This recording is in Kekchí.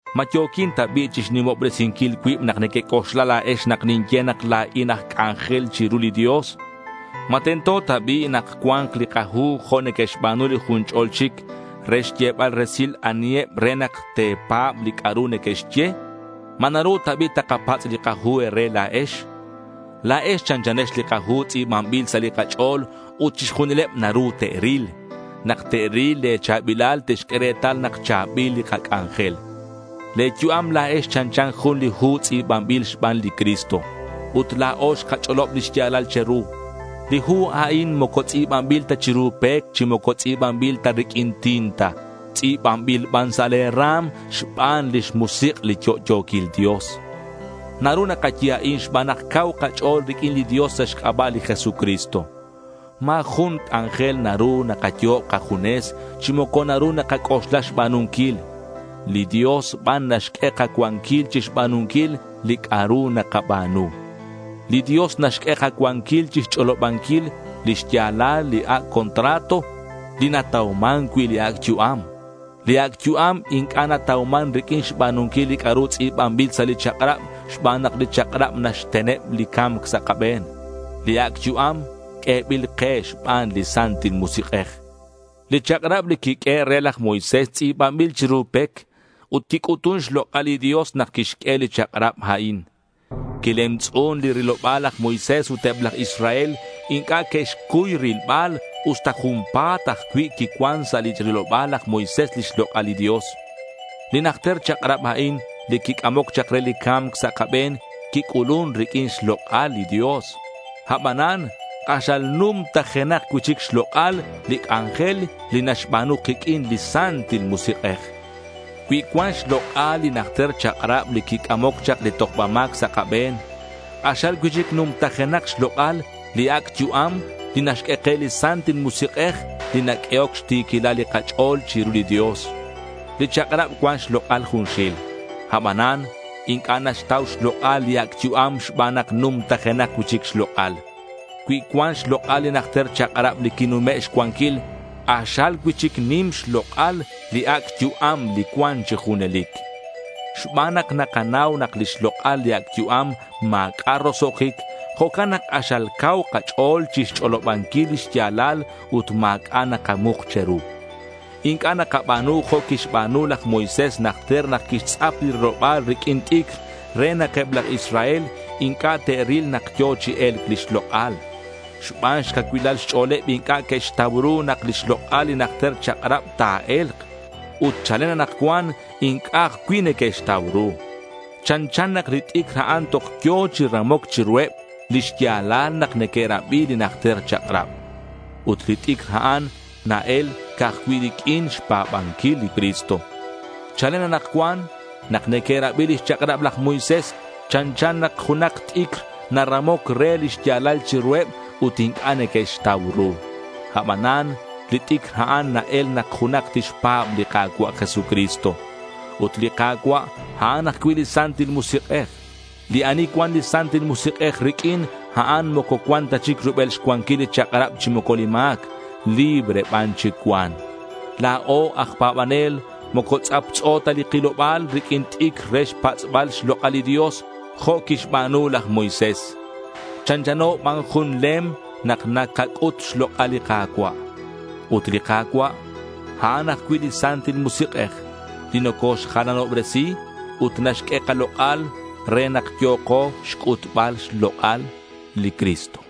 ¿Ma yo̱quin ta bi' chixnimobresinquil cuib nak nequec'oxla la̱ex nak ninye nak la̱in aj c'anjel chiru li Dios? ¿Ma tento ta bi' nak cua̱nk li kahu jo' neque'xba̱nu li jun ch'o̱l chic re xyebal resil aniheb re nak te̱pa̱b li c'a'ru neque'xye? ¿Ma naru ta bi' takapatz' li kahu e̱re la̱ex? La̱ex chanchanex li kahu tz'i̱banbil sa' li kach'o̱l ut chixjunileb naru te'ril. Nak te'ril le̱ cha̱bilal te'xq'ue retal nak cha̱bil li kac'anjel. Le̱ yu'am la̱ex chanchan jun li hu tz'i̱banbil xban li Cristo. Ut la̱o xkach'olob li xya̱lal che̱ru. Li hu a'in moco tz'i̱banbil ta chiru pec chi moco tz'i̱banbil ta riq'uin tinta. Tz'i̱banbil ban sa' le̱ ra̱m xban lix Musik' li yo'yo̱quil Dios. Naru nakaye a'in xban nak cau kach'o̱l riq'uin li Dios sa' xc'aba' li Jesucristo. Ma̱ jun c'anjel naru nakayo'ob kajunes, chi moco naru nakac'oxla xba̱nunquil. Li Dios ban naxq'ue kacuanquil chixba̱nunquil li c'a'ru nakaba̱nu. Li Dios naxq'ue kacuanquilal chixch'olobanquil li xya̱lal li ac' contrato, li natauman cui' li ac' yu'am. Li ac' yu'am inc'a' natauman riq'uin xba̱nunquil li c'a'ru tz'i̱banbil sa' li chak'rab xban nak li chak'rab naxteneb li ca̱mc sa' kabe̱n. Li ac' yu'am q'uebil ke xban li Santil Musik'ej. Li chak'rab li quiq'uehe' re laj Moisés tz'i̱banbil chiru pec ut quic'utun xlok'al li Dios nak quixq'ue li chak'rab a'in. Quilemtz'un li riloba̱l laj Moisés ut eb laj Israel inc'a' que'xcuy rilbal usta junpa̱t ajcui' quicuan sa' li riloba̱l laj Moisés lix lok'al li Dios. Li najter chak'rab a'in li quic'amoc chak re li ca̱mc sa' kabe̱n quic'ulun riq'uin xlok'al li Dios. Abanan k'axal numtajenak cui'chic xlok'al li c'anjel li naxba̱nu kiq'uin li Santil Musik'ej. Cui cuan xlok'al li najter chak'rab li quic'amoc chak li tojba ma̱c sa' kabe̱n, k'axal cui'chic numtajenak xlok'al li ac' yu'am li naxq'ue ke li Santil Musik'ej li naq'uehoc xti̱quilal li kach'o̱l chiru li Dios. Li chak'rab cuan xlok'al junxil. Abanan inc'a' naxtau xlok'al li ac' yu'am xban nak numtajenak cui'chic xlok'al. Cui cuan xlok'al li najter chak'rab li quinume' xcuanquil, k'axal cui'chic nim xlok'al li ac' yu'am li cuan chi junelic. Xban nak nakanau nak lix lok'al li ac' yu'am ma̱c'a' roso'jic, jo'can nak k'axal cau kach'o̱l chixch'olobanquil li xya̱lal ut ma̱c'a' nakamuk che̱ru. Inc'a' nakaba̱nu jo' quixba̱nu laj Moisés najter nak quixtz'ap li riloba̱l riq'uin t'icr re nak eb laj Israel inc'a' te'ril nak yo̱ chi e̱lc lix lok'al. Xban xcacuilal xch'o̱leb inc'a' que'xtau ru nak lix lok'al li najter chak'rab ta̱e̱lk. Ut chalen anakcuan inc'a' ajcui' neque'xtau ru. Chanchan nak li t'icr a'an toj yo̱ chi ramoc chiruheb li xya̱lal nak neque'rabi li najter chak'rab. Ut li t'icr a'an na-el ca'aj cui' riq'uin xpa̱banquil li Cristo. Chalen anakcuan nak neque'rabi lix chak'rab laj Moisés, chanchan nak junak t'icr naramoc re li xya̱lal chiruheb ut inc'a' neque'xtau ru. Abanan li t'icr a'an na-el nak junak tixpa̱b li Ka̱cua' Jesucristo. Ut li Ka̱cua', a'an ajcui' li Santil Musik'ej. Li ani cuan li Santil Musik'ej riq'uin, a'an moco cuan ta chic rubel xcuanquil li chak'rab chi moco li ma̱c. Libre ban chic cuan. La̱o aj pa̱banel moco tz'aptz'o ta li kiloba̱l riq'uin t'icr re xtz'apbal xlok'al li Dios jo' quixba̱nu laj Moisés. Chanchano ban jun lem nak nakac'ut xlok'al li Ka̱cua'. Ut li Ka̱cua' a'an ajcui' li Santil Musik'ej li nocoxjalanobresi ut naxq'ue kalok'al re nak yo̱ko xc'utbal xlok'al li Cristo.